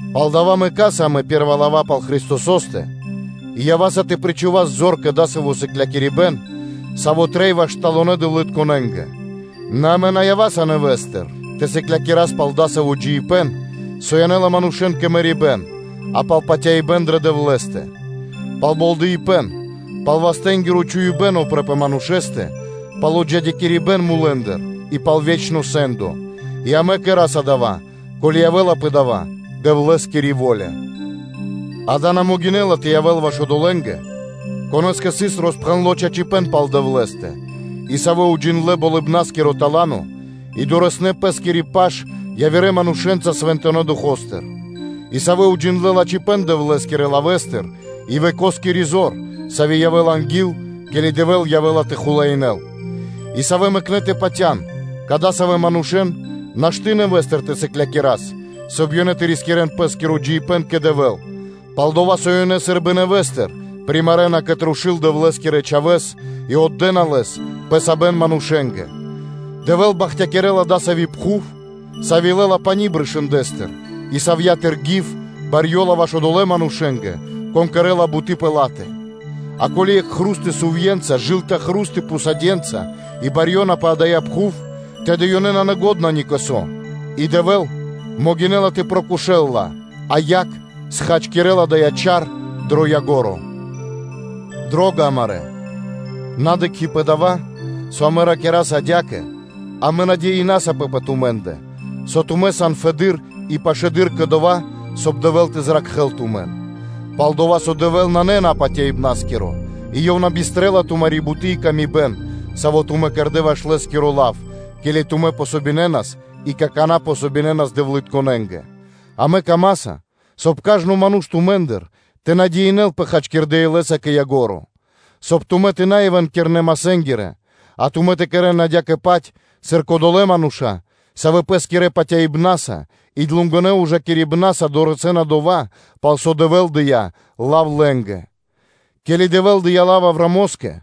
Палдава́ мэкаса амэ пэ́рва лава́ пал Христосо́стэ и ява́са тэ пириджас тэ причхувас зор кэ дасаво сыклякирибэ́н, саво́ трэй ваш сталонэ дэвлытконэнгэ; нэ амэ на ява́са нэвэ́стыр тэ сыклякирас пал дасаво джиибэ́н, со янэ́ла манушэ́н кэ мэрибэ́н, а пал патяибэ́н дрэ Дэвлэ́стэ; пал болдэипэн, пал вастэнгиро чхуибэ́н упрэ́ пэ манушэ́стэ, пал отджидякирибэн мулэ́ндыр и пал ве́чно сэ́ндо. И амэ кэра́са дава́, ко́ли явэ́ла пэ дава́ Дэвлэ́скири во́ля. Дава́ на могинэ́ла (шашты) тэ явэ́л ваш одолэ́нгэ, конэ́скэ сыс роспхэндло чачипэ́н пал Дэвлэ́стэ, и савэ́ уджиндлэ́ Болыбна́скиро тала́но (да́ро), и дорэснэ́ (долынэ) пэ́скири паш явирэ манушэ́нца Свэнтонэ́ Духо́стыр; и савэ́ уджиндлэ́ лачхипэ́н Дэвлэ́скирэ лавэ́стыр и векоскири зор, сави́ явэ́ла анги́л, ке́ли Дэвэ́л явэ́ла тэ хулаинэ́л; и савэ́ мэкнэ́ тэ патя́н; кадасавэн манушэ́н нашты́ нэвэ́стыр тэ сыклякирас, соб (кай) ёнэ тэ рискирэ́н пэ́скиро джиибэ́н кэ Дэвэ́л, пал-дова́ со ёнэ сы́рбы нэвэ́стыр примарэна кэ трушу́л Дэвлэ́скирэ Чхавэ́с и отдэна Лэс пэ сабэн манушэ́нгэ. Дэвэ́л бахтякирэ́ла дасави́ пхув, сави́ лэ́ла пани́ брышындэстыр и савья́тыр гив барьёла ваш одолэ́ манушэ́нгэ, кон кэрэ́ла буты́ пэ ла́тэ; а ко́ли екх хру́сто сувье́нца (дылыны чар) и пхусады́тко хру́сто (ґарь) барьёна пэ дая́ пхув, тэды ёй исын налачхи ни кэ со, и Дэвэ́л могинэ́ла тэ прокошэл ла, а яг схачкирэ́ла дая́ чар дро ко́нцо (дро яго́ро). Дро́га амарэ́, на дыкхи́ пэ дава́, со амэ ракираса адя́кэ, амэ патя́са дрэ тумэ́ндэ, со тумэ́ сан фэды́р и пашылэды́р кэ дова́, соб (кай) Дэвэ́л тэ зракхэ́л тумэн. Пал-дова́ со Дэвэ́л нанэ напатяибнаскиро и Ёв на бистрэла тумари́ буты́ и паты́в кэ яви́р мануша́, савэ́ тумэ́ кэрдэ́ ваш Лэ́скиро лав, ке́ли тумэ́ помогинэнас (дэ́нас васта́) и какана́ помогинэна дэвлытконэнгэ. Амэ камаса, соб (кай) кажно ману́ш тумэ́ндыр тэ патял хачкирдэ́ илэ́са кэ ко́нцо (кэ яго́ро), соб (кай) тумэ́ тэ на явэ́н кирнэ-масэ́нгиро, а тумэ́ тэ кэрэ́н адя́кэ-паць, сыр кодолэ́ мануша́, савэ́ пэ́скирэ патяибна́са и длугонэ ужакирибнаса дорэсэ́на дова́, пал со Дэвэ́л дыя́ лав лэ́нгэ. Ке́ли Дэвэ́л дыя́ лав Авраамо́скэ,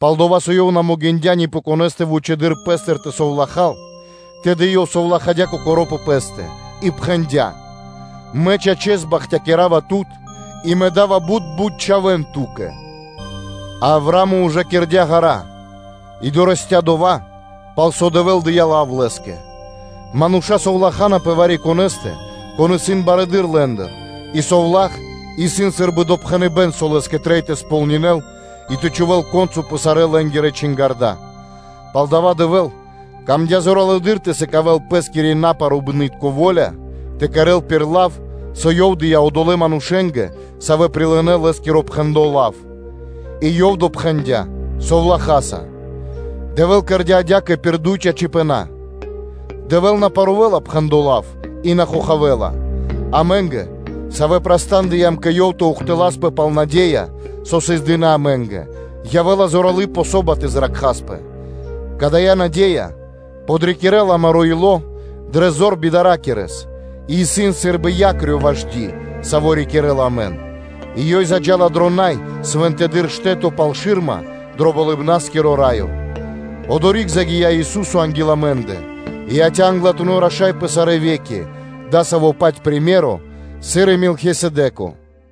пал-дова́ со Ёв на могиндя́ ни пэ конэ́стэ вучэды́р Пэ́стыр тэ совлахал, тэды Ёв совлахадя́ Кокоро́ пэ Пэ́стэ, и пхэндя́: “Мэ, чачэс, бахтякирава Тут и Мэ да́ва бут бут чхавэ́н ту́кэ”; а Авраа́мо ужакирдя ґара́ (длу́гэс) и дорэсця́ дова́, пал со Дэвэ́л дыя́ лав лэ́скэ. Мануша́ совлахана пэ вари-конэ́стэ, кон исын барэды́р лэ́ндыр и совла́х исын сы́рбы допхэныбэ́н, со лэ́скэ трэй тэ сполнинэл и тэ чхувэ́л ко́нцо (яго́ро) пэ сарэ́ лэ́нгирэ чингарда́. Палдава́ Дэвэ́л выкэдыя́ зоралэды́р тэ сыкавэ́л Пэ́скири напаруибны́тко во́ля тэ кэрэ́л кэ ко́нцо (кэ яго́ро) лав, со Ёв дыя́ одолэ́ манушэ́нгэ, савэ́ прилынэ́ Лэ́скиро пхэндло́ лав, и Ёв допхэндя совлахаса. Дэвэ́л кэрдя́ адя́кэ пир дуй чачипэна́: Дэвэ́л на парувэла пхэндло́ лав и на хохавэла. Амэ́нгэ, савэ́ чхурдыямпэ кэ Ёв тэ ухтыласпэ пал наде́я, со сыс дыны́ амэ́нгэ, явэ́ла зорало́ подыно васт (помошш) тэ зракхаспэ. Кадая́ наде́я подрикирэ́ла амаро́ ило́ дрэ зор бидаракирэс и исын сы́рбы якрё ваш ди, саво́ рикирэ́ла амэн, и ёй заджа́ла дро най свэнтэдыр штэ́то пал шы́рма, дро Болыбна́скиро Раё, одори́к загия́ Ису́со анги́л амэ́ндэ, и яця́ Англатунэ́ Раша́са пэ сарэ́ ве́ки, пир дасаво-паць титуло, сыр и Мелхисэдэко.